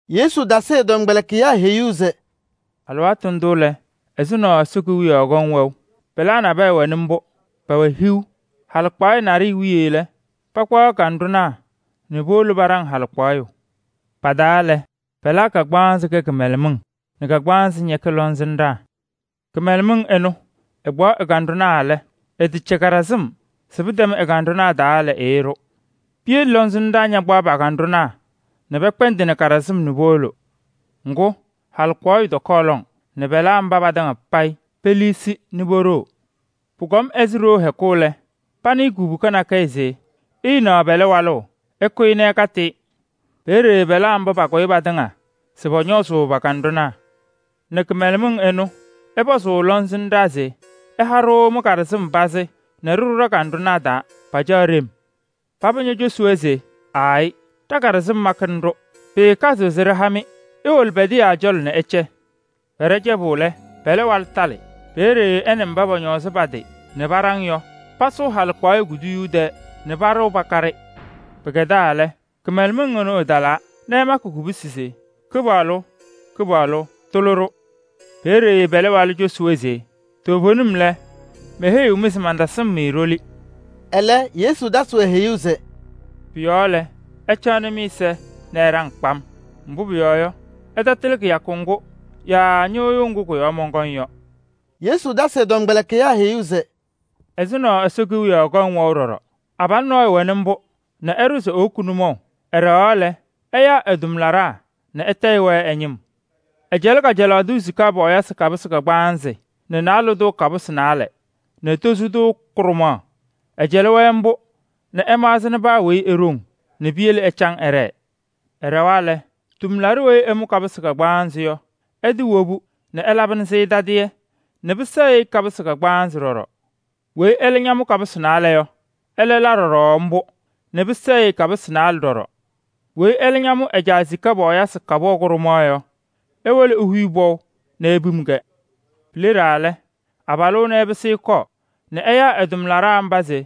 Yesu tasɩ ɛ-tɔmkpɛlɩkɩyaa heyuu se: “Alɩwaatʋ ndʋ lɛ, ɛzʋnɔ Ɛsɔ Kewiyaɣ kɔŋ wɛʋ: pɛlaa nabɛyɛ wɛnɩ mbʋ, pɛwɛ hiu. Halɩkpaɣyɛ naɖɩyɛ wiye lɛ, pakpaɣ kanɖʋnaa nɛ powolo paɖaŋ halɩkpaɣyʋ. Pa-taa lɛ, pɛlaa kagbaanzɩ kɛ kɩmɛlɛmɩŋ nɛ kagbaanzɩ ñɛkɛ lɔŋsɩnɖaa. Kɩmɛlɛmɩŋ ɩnʋ, ɩkpaɣ ɩ-kanɖʋnaa lɛ, ɩtɛcɛ kaɖɩsɩm se pɩtɛm ɩ-kanɖʋnaa taa lɛ, ɩɩɖʋ. Piyele lɔŋsɩnɖaa ñakpaɣ pa-kanɖʋnaa nɛ pɛkpɛndɩnɩ kaɖɩsɩm nɛ powolo. Ŋgʋ, halɩkpaɣyʋ tɔkɔɔ lɔŋ nɛ pɛlaa mba patɩŋa payɩ peliisi nɛ poɖoo. “Pʋkɔm ɛzɩ ɖoo hɛkʋ lɛ, panɩɩ kubuka nakɛyɛ se: ‘Ɩɩnaɣ pɛlɛ walʋ! Ɩkʋyɩ nɛ ɩkatɩ-ɩ!’ Peeye pɛlaa mba pakʋyɩ patɩŋa se pɔñɔɔzʋʋ pa-kanɖʋnaa nɛ kɩmɛlɛmɩŋ ɩnʋ, ɩpɔzʋʋ lɔŋsɩnɖaa se: ‘Ɩha-ɖʋ mɩ-kaɖɩsɩm pazɩ nɛ ɖɩɖʋ ɖa-kanɖʋnaa taa: pacaɣ ɖem.’ Paba ñocosi-wɛ se: ‘Aayɩ! Ɖa-kaɖɩsɩm makɩnɩ-ɖʋ, pɩɩkazɩɣ se ɖɩha-mɩ. Iwolo pɛdɩyaa cɔlɔ nɛ ɩcɛ.’ Pɛɖɛ cɛbʋ lɛ, pɛlɛ walʋ talɩ. Peeye ɛ nɛ mba pɔñɔɔzɩ pa-tɩ nɛ paɖaŋ-ɩ yɔ, pasʋ halɩkpaɣyɛ kuduyuu tɛɛ nɛ paɖɩɣ pakaɖɩ. Pɩkɛdaa lɛ, kɩmɛlɛmɩŋ ɩnʋ ɩtalaa nɛ ɩmakɩ kubusi se: ‘Kɩpaɣlʋ! Kɩpaɣlʋ! Tʋlɩ-ɖʋ!’ Peeye pɛlɛ walʋ cosi-wɛ se: ‘Toovenim lɛ, meheyiɣ-mɩ se mantasɩm-mɩ ɖoli.’” Ɛlɛ Yesu tasɩ-wɛ heyuu se: “Pʋ-yɔɔ lɛ, ɩcaɣnɩ mɩ-ɛza nɛ ɩɖaŋ kpam, mbʋ pʋyɔɔ yɔ, ɩtatɩlɩ kɩyakʋ ŋgʋ yaa ñɩɣyʋʋ ŋgʋ kʋ-yɔɔ mɔnkɔŋ yɔ.” Yesu tasɩ ɛ-tɔmkpɛlɩkɩyaa heyuu se: “Ɛzʋnɔ Ɛsɔ Kewiyaɣ kɔŋ wɛʋ ɖɔɖɔ: abalʋ nɔɔyʋ wɛnɩ mbʋ nɛ ɛɖʋ se ewoki nʋmɔʋ. Ɛɖɛɣaɣ lɛ, ɛyaa ɛ-tʋmlaɖaa nɛ ɛtayɩ-wɛ ɛ-ñɩm. Ɛcɛlɩ kajalaɣ tʋ sika pɔɔyɩsɩ kapʋsɩ kagbaanzɩ nɛ naalɛ tʋ kapʋsɩ naalɛ nɛ tozo tʋ kʋɖʋmaɣ. Ɛcɛlɩ-wɛ mbʋ nɛ ɛmaɣzɩnɩ paa weyi e-ɖoŋ nɛ piyele ɛcaŋ ɛɖɛɛ. Ɛɖɛwa lɛ, tʋmlaɖʋ weyi ɛmʋ kapʋsɩ kagbaanzɩ yɔ, ɛtɩwobu nɛ ɛlabɩnɩ-sɩ tadɩyɛ nɛ pɩsɛɛ-ɩ kapʋsɩ kagbaanzɩ ɖɔɖɔ. Weyi ɛlɛ ñamʋ kapʋsɩ naalɛ yɔ, ɛlɛ la ɖɔɖɔ mbʋ nɛ pɩsɛɛ-ɩ kapʋsɩ naalɛ ɖɔɖɔ. Weyi ɛlɛ ñamʋ ɛ-caa sika pɔɔyɩsɩ kapʋwa kʋɖʋmaɣ yɔ, ewolo ehuyi pɔʋ nɛ epim-kɛ. “Pileɖaa lɛ, abalʋ ɛnʋ ɛpɩsɩ ɛkɔɔ nɛ ɛyaa ɛ-tʋmlaɖaa mba se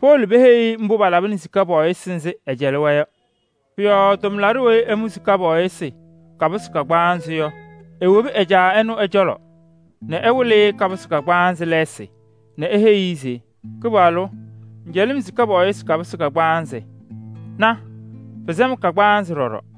powolo peheyi-i mbʋ palabɩnɩ sika pɔɔyɩsɩ kapʋsɩ nzɩ ɛɛcɛlɩ-wɛ yɔ. Pʋ-yɔɔ tʋmlaɖʋ weyi ɛmʋ sika pɔɔyɩsɩ kapʋsɩ kagbaanzɩ yɔ, ewobi ɛ-caa ɛnʋ ɛ-cɔlɔ nɛ ɛwɩlɩ-ɩ kapʋsɩ kagbaanzɩ lɛɛsɩ nɛ eheyi-i se: ‘Kɩpaɣlʋ! Ŋŋcɛlɩ-m sika pɔɔyɩsɩ kapʋsɩ kagbaanzɩ. Na! Pɩsɛ-m kagbaanzɩ ɖɔɖɔ.’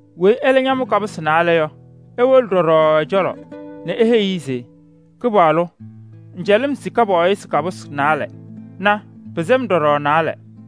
Weyi ɛlɛ ñaamʋ kapʋsɩ naalɛ yɔ, ewolo ɖɔɖɔ ɛ-cɔlɔ nɛ eheyi-i se: ‘Kɩpaɣlʋ! Ŋŋcɛlɩ-m sika pɔɔyɩsɩ kapʋsɩ naalɛ. Na! Pɩsɛ-m ɖɔɖɔ naalɛ.’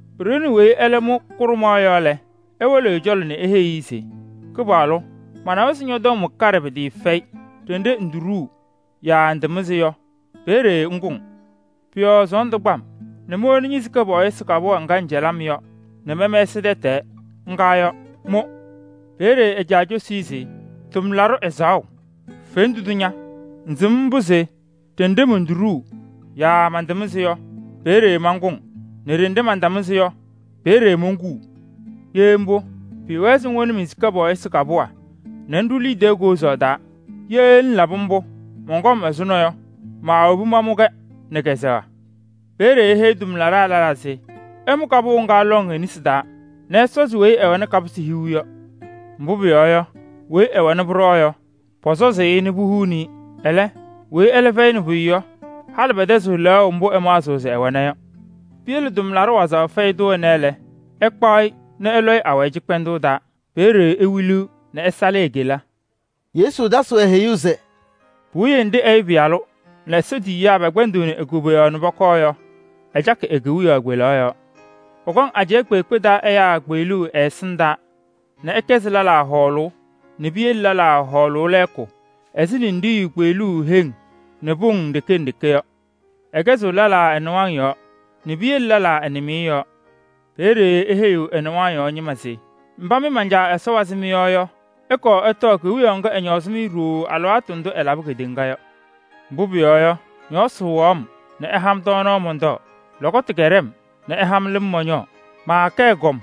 Pɩɖɩɣnɩ weyi ɛlɛ mʋ kʋɖʋmaɣ yɔ lɛ, ewolo ɛ-cɔlɔ nɛ eheyi-i se: ‘Kɩpaɣlʋ! Manawa se ñɔ-tɔm wɛ kaɖɛ pɩtɩɩfɛyɩ. Ɖenɖe ŋtoɖuu yaa ŋtamɩzɩ yɔ, peeye ŋkʋŋ. Pʋ-yɔɔ sɔɔndʋ kpa-m nɛ mowoni ñe-sika pɔɔyɩsɩ kapʋwa ŋga ŋcɛlɩ-m yɔ nɛ mɛmɛsɩ tɛtɛɛ. Ŋga yɔ, mʋ!’ Peeye ɛ-caa cosi-i se: ‘Tʋmlaɖʋ ɛzaɣʋ, fendu ña! Ŋsɩm mbʋ se ɖenɖe montoɖuu yaa mantamɩzɩ yɔ, peeye mankʋŋ nɛ ɖenɖe mantamɩzɩ yɔ, peeye monkuu. Ye mbʋ, pɩɩwɛɛ se ŋwoni men-sika pɔɔyɩsɩ kapʋwa nɛ ŋɖʋ liidiye koozaɣ taa. Tɛtɛɣ mɔnkɔm ɛzʋnɔ yɔ, maawobi mamʋ-kɛ nɛ kɛ-kɛzɛɣ.’ Peeye eheyi tʋmlaɖaa lɛlaa se: ‘Ɩmʋ kapʋwa ŋga lɔŋ e-nesi taa nɛ ɩsɔzɩ weyi ɛwɛnɩ kapʋsɩ hiu yɔ. Mbʋ pʋyɔɔ yɔ, weyi ɛwɛna pʋɖɔɔ yɔ, pɔsɔzʋʋ-ɩ nɛ puhuuni-i. Ɛlɛ, weyi ɛlɛ fɛyɩnɩ pʋyʋ yɔ, halɩ pɛtɛzɩɣ lɛɣʋ mbʋ ɛmaɣzɩɣ se ɛwɛna yɔ. Piyele tʋmlaɖʋ wazaɣ fɛyɩ tʋ ɛnɛ lɛ, ɩkpaɣ-ɩ nɛ ɩlɔ-ɩ awayɩ cɩkpɛndʋʋ taa. Peeye ewiliɣ nɛ ɛsalɩ e-kela.’” Yesu tasɩ-wɛ heyuu se: “Puwiye nɖɩ Ɛyʋ Pɩyalʋ nɛ Ɛsɔ tiyiyaa tɩŋa pɛkpɛndɩɣnɩ e-koboyaɣ nɛ pɔkɔɔ yɔ, ɛcakɩ e-kewiyaɣ kpelaɣ yɔɔ. Pɔkɔŋ ajɛɛ kpeekpe taa ɛyaa kpeɣluu ɛ-ɛsɩndaa nɛ ɛkɛzɩ lɛlaa hɔɔlʋʋ nɛ piyele lɛlaa hɔɔlʋʋ lɛɛkʋ ɛzɩ ninɖiɣyu kpeɣluuu heŋ nɛ pʋŋ nɖeke nɖeke yɔ. Ɛkɛzɩɣ lɛlaa ɛ-nɩwaŋ yɔɔ nɛ piyele lɛlaa ɛ-nɩmɩyɛ yɔɔ. Peeye eheyiɣ ɛ-nɩwaŋ yɔɔ ñɩma se: ‘Mba mɩ man-Caa Ɛsɔ wazɩ mɩ-yɔɔ yɔ, ɩkɔɔ ɩtɔɔ Kewiyaɣ ŋga ɛñɔɔzɩ-mɩ ɖooo alɩwaatʋ ndʋ ɛlabɩ kedeŋa yɔ. Mbʋ pʋyɔɔ yɔ, ñɔɔsɩ wɩɣaɣ-m nɛ ɩha-m tɔɔnaɣ mɔntɔɔ. Lɔkɔtʋ kɛɖɛ-m ɩha-m lɩm mɔñɔɔ. Maakɛ ɛgɔm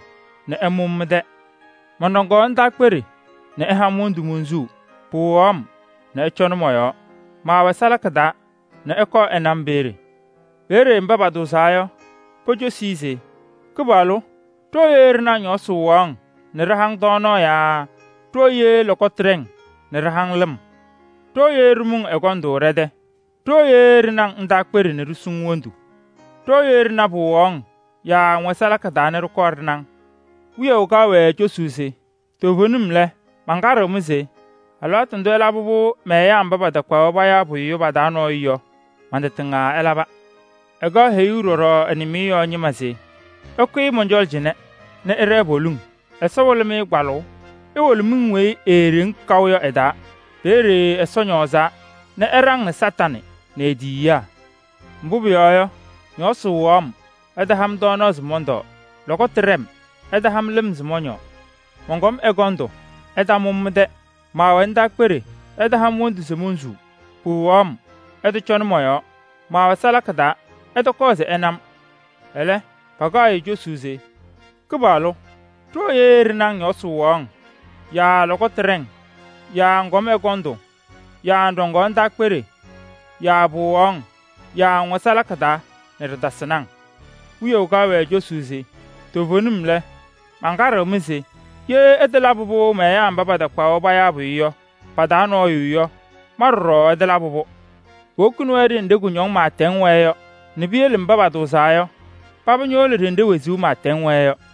nɛ ɩmʋ-m mɩ-tɛ. Mɔnɖɔŋaɣ ndaakpeɖe nɛ ɩha-m wondu monsuu. Pɩwɩɣaɣ-m nɛ ɩcɔnɩ mɔ-yɔɔ. Maawɛ salaka taa nɛ ɩkɔɔ ɩna-m peeye.’ Peeye mba patʋʋzaa yɔ, pocosuu-i se: ‘Kɩpaɣlʋ! Ɖooye ɖɩna-ŋ ñɔɔsɩ wɩɣaɣ-ŋ nɛ ɖɩha-ŋ tɔɔnaɣ yaa ɖooye lɔkɔtʋ ɖɛ-ŋ nɛ ɖɩha-ŋ lɩm? Ɖooye ɖɩmʋ-ŋ ɛgɔndʋ ɖɛ-tɛ? Ɖooye ɖɩna-ŋ ndaakpeɖe nɛ ɖisu-ŋ wondu? Ɖooye ɖɩna pɩwɩɣaɣ-ŋ yaa ŋwɛ salaka taa nɛ ɖɩkɔɔ ɖɩna-ŋ?’ Wiyaʋ kaɣ-wɛ cosuu se: ‘Toovenim lɛ, mankaɖɩɣ-mɩ se: alɩwaatʋ ndʋ ɩlabɩ-pʋ mɛ-ɛyaa mba patakpaɣ-wɛ payaa pʋyʋ yɔ pa-taa nɔɔyʋ yɔ, man-tɩ tɩŋa ɩlaba.’ “Ɛkaɣ heyuu ɖɔɖɔ ɛ-nɩmɩyɛ yɔɔ ñɩma se: ‘Ɩkʋyɩ mɔn-cɔlɔ cɩnɛ nɛ ɩɖɛɛ poliŋ, Ɛsɔ wɩlɩ-mɩ kpalʋʋ! Iwolo miŋ weyi eeɖeŋ kaʋ yɔ ɛ-taa. Peeye Ɛsɔ ñɔɔzaa nɛ ɛɖaŋnɩ Kañadʋ Satanɩ nɛ e-tiyiyaa! Mbʋ pʋyɔɔ yɔ, ñɔɔsɩ wɩɣaɣ-m, ɩtaha-m tɔɔnaɣ se mɔntɔɔ. Lɔkɔtʋ ɖɛ-m, ɩtaha-m lɩm se mɔñɔɔ. Mɔnkɔm ɛgɔndʋ, ɩtamʋ-m mɩ-tɛ. Maawɛ ndaakpeɖe, ɩtaha-m wondu se monsuu, pɩwɩɣaɣ-m, ɩtɔcɔnɩ mɔ-yɔɔ. Maawɛ salaka taa, ɩtɔkɔɔ se ɩna-m.’ Ɛlɛ, pakaɣ-ɩ cosuu se: ‘Kɩpaɣlʋ! Ɖooye ɖɩna-ŋ ñɔɔsɩ wɩɣaɣ-ŋ yaa lɔkɔtʋ ɖɛ-ŋ yaa ŋkɔm ɛgɔndʋ yaa ŋɖɔŋaɣ ndaakpeɖe yaa pɩwɩɣaɣ-ŋ yaa ŋwɛ salaka taa nɛ ɖɩtasɩnɩ-ŋ?’ Wiyaʋ kaɣ-wɛ cosuu se: ‘Toovenim lɛ, mankaɖɩɣ-mɩ se: ye ɩtalabɩ-pʋ mɛ-ɛyaa mba patakpaɣ-wɛ payaa pʋyʋ yɔ, pa-taa nɔɔyʋ yɔ, ma ɖɔɖɔ ɩtalabɩ-pʋ.’ Powokini-wɛ ɖenɖe kʋñɔŋ pɩɩtɛŋ wɛɛ yɔ nɛ piyele mba patʋʋzaa yɔ, paba ñowolo ɖenɖe wezuu pɩɩtɛŋ wɛɛ yɔ.”